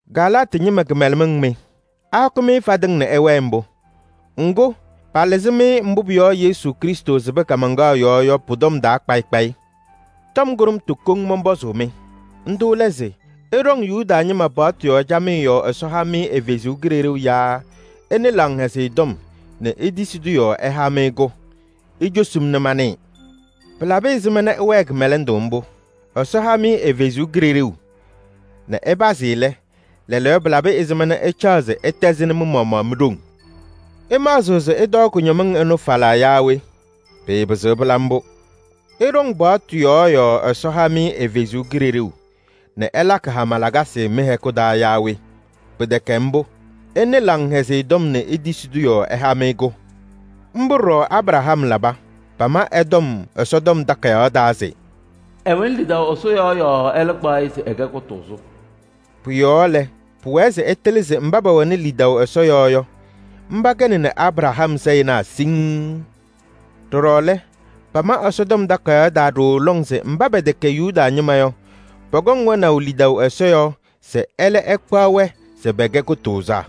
Galaatɩ ñɩma kɩmɛlɛmɩŋ mɩ! Ahɔkɩ-m fadɩŋ nɛ ɩwɛɛ mbʋ? Ŋgʋ, palɩzɩ-mɩ mbʋ pʋ-yɔɔ Yesu Krɩstʋ sɩbɩ kaamaŋkaɣ yɔɔ yɔ pʋ-tɔm taa kpayɩ kpayɩ. Tɔm kʋɖʋmtʋ koŋ mɔnpɔzʋʋ-mɩ, ndʋ lɛ se: ɩɖɔŋ Yuda ñɩma paɣtʋ yɔɔ camɩyɛ yɔɔ Ɛsɔ ha-mɩ ɛ-Kalɩzaɣ yaa ɩnɩ Laŋhɛzɩyɛ Tɔm nɛ itisi-tʋ yɔɔ ɛha-mɩ-kɛ? Icosi-m nɛ manɩɩ. Pɩlabɩ ɛzɩma nɛ ɩwɛɛ kɩmɛlɛndʋ mbʋ? Ɛsɔ ha-mɩ ɛ-Kalɩzaɣ nɛ ɩpazɩ lɛ, lɛɛlɛɛyɔ pɩlabɩ ɛzɩma nɛ ɩcaɣ se ɩtɛzɩnɩ mɩ-maɣmaɣ mi-ɖoŋ? Ɩmaɣzɩɣ se ɩtɔɔ kʋñɔmɩŋ ɩnʋ falaa yaa we? Pɩɩpɩzɩɣ pɩla mbʋ. Ɩɖɔŋ paɣtʋ yɔɔ yɔɔ Ɛsɔ ha-mɩ ɛ-Kalɩzaɣ nɛ ɛlakɩ hama lakasɩ mɩ-hɛkʋ taa yaa we? Pɩtɛkɛ mbʋ! Ɩnɩ Laŋhɛzɩyɛ Tɔm nɛ itisi-tʋ yɔɔ ɛha-mɩ-kɛ. Mbʋ ɖɔɖɔ Abraham laba. Pama ɛ-tɔm Ɛsɔtɔm Takayaɣ taa se: “Ɛwɛnɩ lidaʋ Ɛsɔ yɔɔ yɔɔ ɛlɛ kpaɣ-ɩ se ɛkɛ kʋtʋʋzʋ.” Pʋ-yɔɔ lɛ, pʋwɛɛ se ɩtɩlɩ se mba pɛwɛnɩ lidaʋ Ɛsɔ yɔɔ yɔ, mba kɛnɩ Abraham sayɩnaa siŋŋ. Ɖɔɖɔ lɛ, pama Ɛsɔtɔm Takayaɣ taa ɖooo lɔŋ se mba pɛtɛkɛ Yuda ñɩma yɔ, pɔkɔŋ wɛnaʋ lidaʋ Ɛsɔ yɔɔ se ɛlɛ ɛkpaɣ-wɛ se pɛkɛ kʋtʋʋzaa.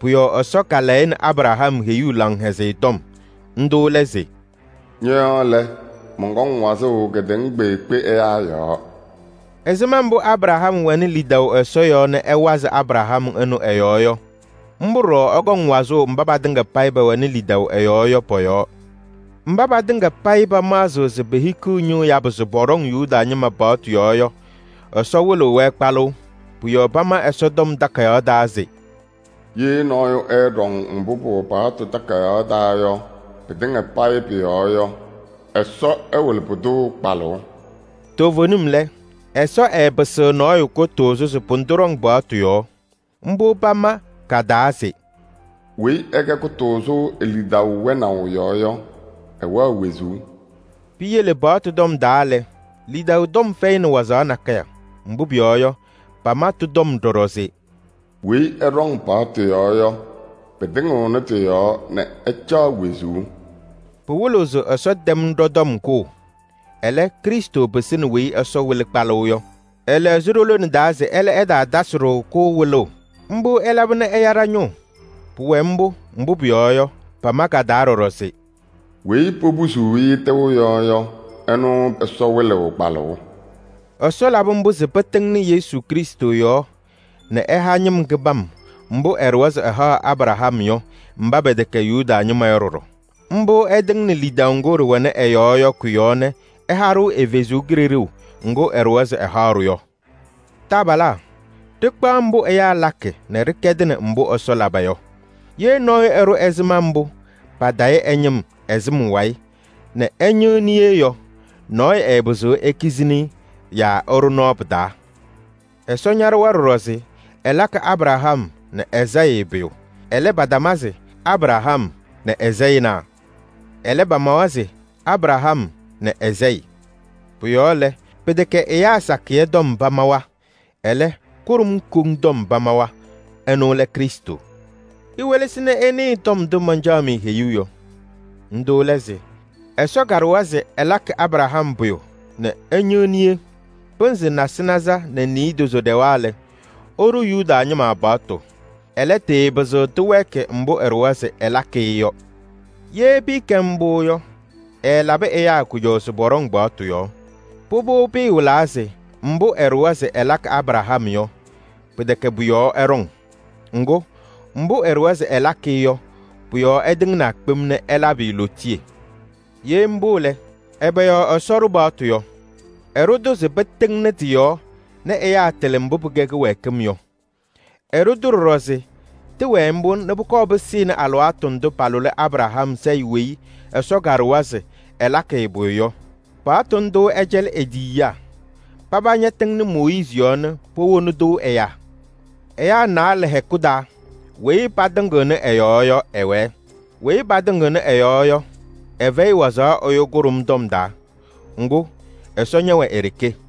Pʋ-yɔɔ Ɛsɔ kalayɩnɩ Abraham heyuu laŋhɛzɩyɛ tɔm. Ndʋ lɛ se: “Ñɔ-yɔɔ lɛ, mɔnkɔŋ wazʋʋ kedeŋa kpeekpe ɛyaa yɔɔ.” Ɛzɩma mbʋ Abraham wɛnɩ lidaʋ Ɛsɔ yɔɔ nɛ ɛwazɩ Abraham ɛnʋ ɛ-yɔɔ yɔ, mbʋ ɖɔɖɔ ɛkɔŋ wazʋʋ mba patɩŋa payɩ pɛwɛnɩ lidaʋ ɛ-yɔɔ yɔ pɔ-yɔɔ. Mba patɩŋa payɩ pamaɣzɩɣ se pehikiɣ ñʋʋ yabʋ se pɔɖɔŋ Yuda ñɩma paɣtʋ yɔɔ yɔ, Ɛsɔ wɩlɩɣ-wɛ kpalʋʋ. Pʋ-yɔɔ pama Ɛsɔtɔm Takayaɣ taa se: “Ye nɔɔyʋ ɛɛɖɔŋ mbʋ pɩwɛ paɣtʋ takayaɣ taa yɔ pɩtɩŋa payɩ pʋ-yɔɔ yɔ, Ɛsɔ ɛwɩlɩ pʋdʋ kpalʋʋ.” Toovenim lɛ, Ɛsɔ ɛɛpɩsɩɣ nɔɔyʋ kʋtʋʋzʋ se pʋdʋ ɖɔŋ paɣtʋ yɔɔ. Mbʋ pama ka-taa se: “Weyi ɛkɛ kʋtʋʋzʋ e-lidaʋ wɛnaʋ yɔɔ yɔ, ɛwɛɣ wezuu.” Piyele paɣtʋ tɔm taa lɛ, lidaʋ tɔm fɛyɩnɩ wazaɣ nakɛyɛ. Mbʋ pʋyɔɔ yɔ, pama tɩ-tɔm ɖɔɖɔ se: “Weyi ɛɖɔŋ paɣtʋ yɔɔ yɔ, pɩtɩŋɩɣnɩ tɩ-yɔɔ nɛ ɛcaɣ wezuu.” Pɩwɩlɩɣ se Ɛsɔ tɛm ɖɔ-tɔm kʋʋ. Ɛlɛ, Krɩstʋ pɩsɩnɩ weyi Ɛsɔ wɩlɩ kpalʋʋ yɔ. Ɛlɛɣzɩ ɖo-lone taa se ɛlɛ ɛtaatasɩ-ɖʋ-kʋ wɩlʋʋ. Mbʋ ɛlaba nɛ ɛya ɖa-ñʋʋ. Pʋwɛ mbʋ, mbʋ pʋyɔɔ yɔ, pama ka-taa ɖɔɖɔ se: “Weyi popusuuni-i nɛ tɩʋ yɔ, ɛnʋ Ɛsɔ wɩlɩɣ kpalʋʋ.” Ɛsɔ labɩ mbʋ se pɩtɩŋnɩ Yesu Krɩstʋ yɔɔ nɛ ɛha ñɩm kɩbam mbʋ ɛɖʋwa se ɛhaɣ Abraham yɔ mba pɛtɛkɛ Yuda ñɩma yɔ ɖɔɖɔ. Mbʋ ɛtɩŋnɩ lidaʋ ŋgʋ ɖɩwɛnɩ ɛ-yɔɔ yɔ kʋ-yɔɔ nɛ ɛha-ɖʋ ɛ-Kalɩzaɣ ŋga ɛɖʋwa se ɛhaɣ-ɖʋ yɔ. Taabalaa! Ɖɩkpaɣ mbʋ ɛyaa lakɩ nɛ ɖɩkɛdɩnɩ mbʋ Ɛsɔ laba yɔ: ye nɔɔyʋ ɛɖʋ ɛzɩma mbʋ patayɩ ɛ-ñɩm ɛ-sɩm wayɩ nɛ ɛ-ñɩɣ niye yɔ, nɔɔyʋ ɛɛpɩzɩɣ ekizini-i yaa ɛɖʋ nɔɔ pɩ-taa. Ɛsɔ ñaɖʋwa ɖɔɖɔ se ɛlakɩ Abraham nɛ ɛ-sayɩ pʋyʋ. Ɛlɛ, patama se: “Abraham nɛ ɛ-sayɩnaa.” Ɛlɛ, pamawa se: “Abraham nɛ ɛ-sayɩ.” Pʋ-yɔɔ lɛ, pɩtɛkɛ ɛyaa sakɩyɛ tɔm pamawa, ɛlɛ, kʋɖʋm koŋ tɔm pamawa. Ɛnʋ lɛ Krɩstʋ. Iwelesi nɛ ɩnɩɩ tɔm ndʋ mancaɣ-mɩ heyuu yɔ. Ndʋ lɛ se: Ɛsɔ kaɖʋwa se ɛlakɩ Abraham pʋyʋ nɛ ɛñɩɣ niye. Pɩnzɩ nasɩnaza nɛ niidozo ɖɛwa lɛ, ɛɖʋ Yuda ñɩma paɣtʋ. Ɛlɛ, tɩɩpɩzɩɣ tɩwɛɛkɩ mbʋ ɛɖʋwa se ɛlakɩ-ɩ yɔ. Ye pɩɩkɛ mbʋ yɔ, ɛɛlabɩ ɛyaa kʋjɔʋ se pɔɖɔŋ paɣtʋ yɔɔ. Pʋbʋ pɩɩwɩlaa se mbʋ ɛɖʋwa se ɛlakɩ Abraham yɔ, pɩtɛkɛ pʋ-yɔɔ ɛɖɔŋ. Ŋgʋ, mbʋ ɛɖʋwa se ɛlakɩ-ɩ yɔ pʋ-yɔɔ ɛtɩŋnaa kpem nɛ ɛlabɩ-ɩ lootiye. Ye mbʋ lɛ, ɛbɛ yɔɔ Ɛsɔ ɖʋ paɣtʋ yɔ? Ɛɖʋ-tʋ se pɩtɩŋnɩ tɩ-yɔɔ nɛ ɛyaa tɩlɩ mbʋ pɩkɛ kɩwɛɛkɩm yɔ. Ɛɖʋ-tʋ ɖɔɖɔ se tɩwɛɛ mbʋ nɛ pʋkɔɔ pɩsɩnɩ alɩwaatʋ ndʋ palʋlɩ Abraham sayɩ weyi Ɛsɔ kaɖʋwa se ɛlakɩ-ɩ pʋyʋ yɔ. Paɣtʋ ndʋ ɛcɛlɩ e-tiyiyaa. Paba ñatɩŋnɩ Mooyiizi yɔɔ nɛ powoni-tʋ ɛyaa. Ɛyaa naalɛ hɛkʋ taa weyi patɩŋɩɣnɩ ɛ-yɔɔ yɔ ɛwɛɛ. Weyi patɩŋɩɣnɩ ɛ-yɔɔ yɔ, ɛfɛyɩ wazaɣ ɛyʋ kʋɖʋm tɔm taa. Ŋgʋ, Ɛsɔ ñɛwɛ e-ɖeke.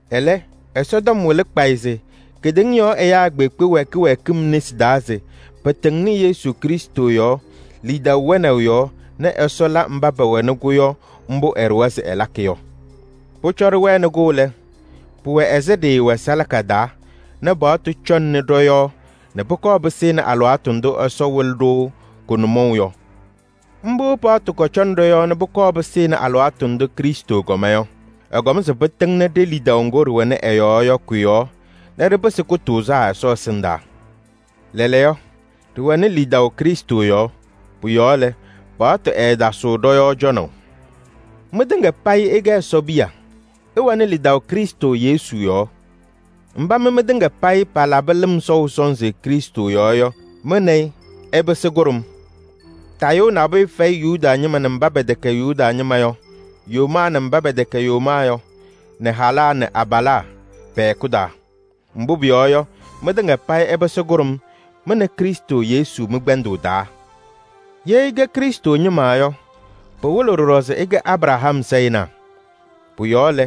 Ɛlɛ, Ɛsɔtɔm wɩlɩ kpayɩ se kedeŋa yɔɔ ɛyaa kpeekpe wɛ kɩwɛɛkɩm nesi taa se pɩtɩŋnɩ Yesu Krɩstʋ yɔɔ lidaʋ wɛnaʋ yɔɔ nɛ Ɛsɔ la mba pɛwɛnɩ-kʋ yɔ mbʋ ɛɖʋwa se ɛlakɩ yɔ. Pʋcɔ ɖɩwɛnɩ-kʋ lɛ, pɩwɛ ɛzɩ ɖɩɩwɛ salaka taa nɛ paɣtʋ cɔŋnɩ ɖɔ-yɔɔ nɛ pʋkɔɔ pɩsɩnɩ alɩwaatʋ ndʋ Ɛsɔ wɩlɩ-ɖʋ kʋ-nʋmɔʋ yɔ. Mbʋ paɣtʋ kɔcɔnɩ ɖɔ-yɔɔ nɛ pʋkɔɔ pɩsɩnɩ alɩwaatʋ ndʋ Krɩstʋ kɔma yɔ. Ɛkɔm se pɩtɩŋnɩ ɖe-lidaʋ ŋgʋ ɖɩwɛnɩ ɛ-yɔɔ yɔ kʋ-yɔɔ nɛ ɖɩpɩsɩ kʋtʋʋzaa Ɛsɔ ɛsɩndaa. Lɛɛlɛɛyɔ, ɖɩwɛnɩ lidaʋ Krɩstʋ yɔɔ. Pʋ-yɔɔ lɛ, paɣtʋ ɛɛtasɩɣ ɖɔ-yɔɔ cɔnaʋ. Mɩtɩŋa payɩ ɩkɛ Ɛsɔ piya: ɩwɛnɩ lidaʋ Krɩstʋ Yesu yɔɔ. Mba mɩ mɩtɩŋa payɩ palabɩ lɩm sɔʋ sɔnzɩ Krɩstʋ yɔɔ yɔ, mɩ nɛ ɩ ɩpɩsɩ kʋɖʋm. Tayʋʋ nabʋyʋ fɛyɩ Yuda ñɩma nɛ mba pɛtɛkɛ Yuda ñɩma yɔ, yomaa nɛ mba pɛtɛkɛ yomaa yɔ, nɛ halaa nɛ abalaa, pɛ-hɛkʋ taa. Mbʋ pʋyɔɔ yɔ, mɩtɩŋa payɩ ɩpɩsɩ kʋɖʋm, mɩ nɛ Krɩstʋ Yesu mɩ-kpɛndʋʋ taa. Ye ɩkɛ Krɩstʋ ñɩma yɔ, pɩwɩlɩɣ ɖɔɖɔ se ɩkɛ Abraham sayɩnaa. Pʋ-yɔɔ lɛ,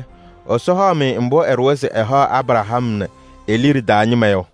Ɛsɔ haɣ-mɩ mbʋ ɛɖʋwa se ɛhaɣ Abraham nɛ e-liɖe taa ñɩma yɔ.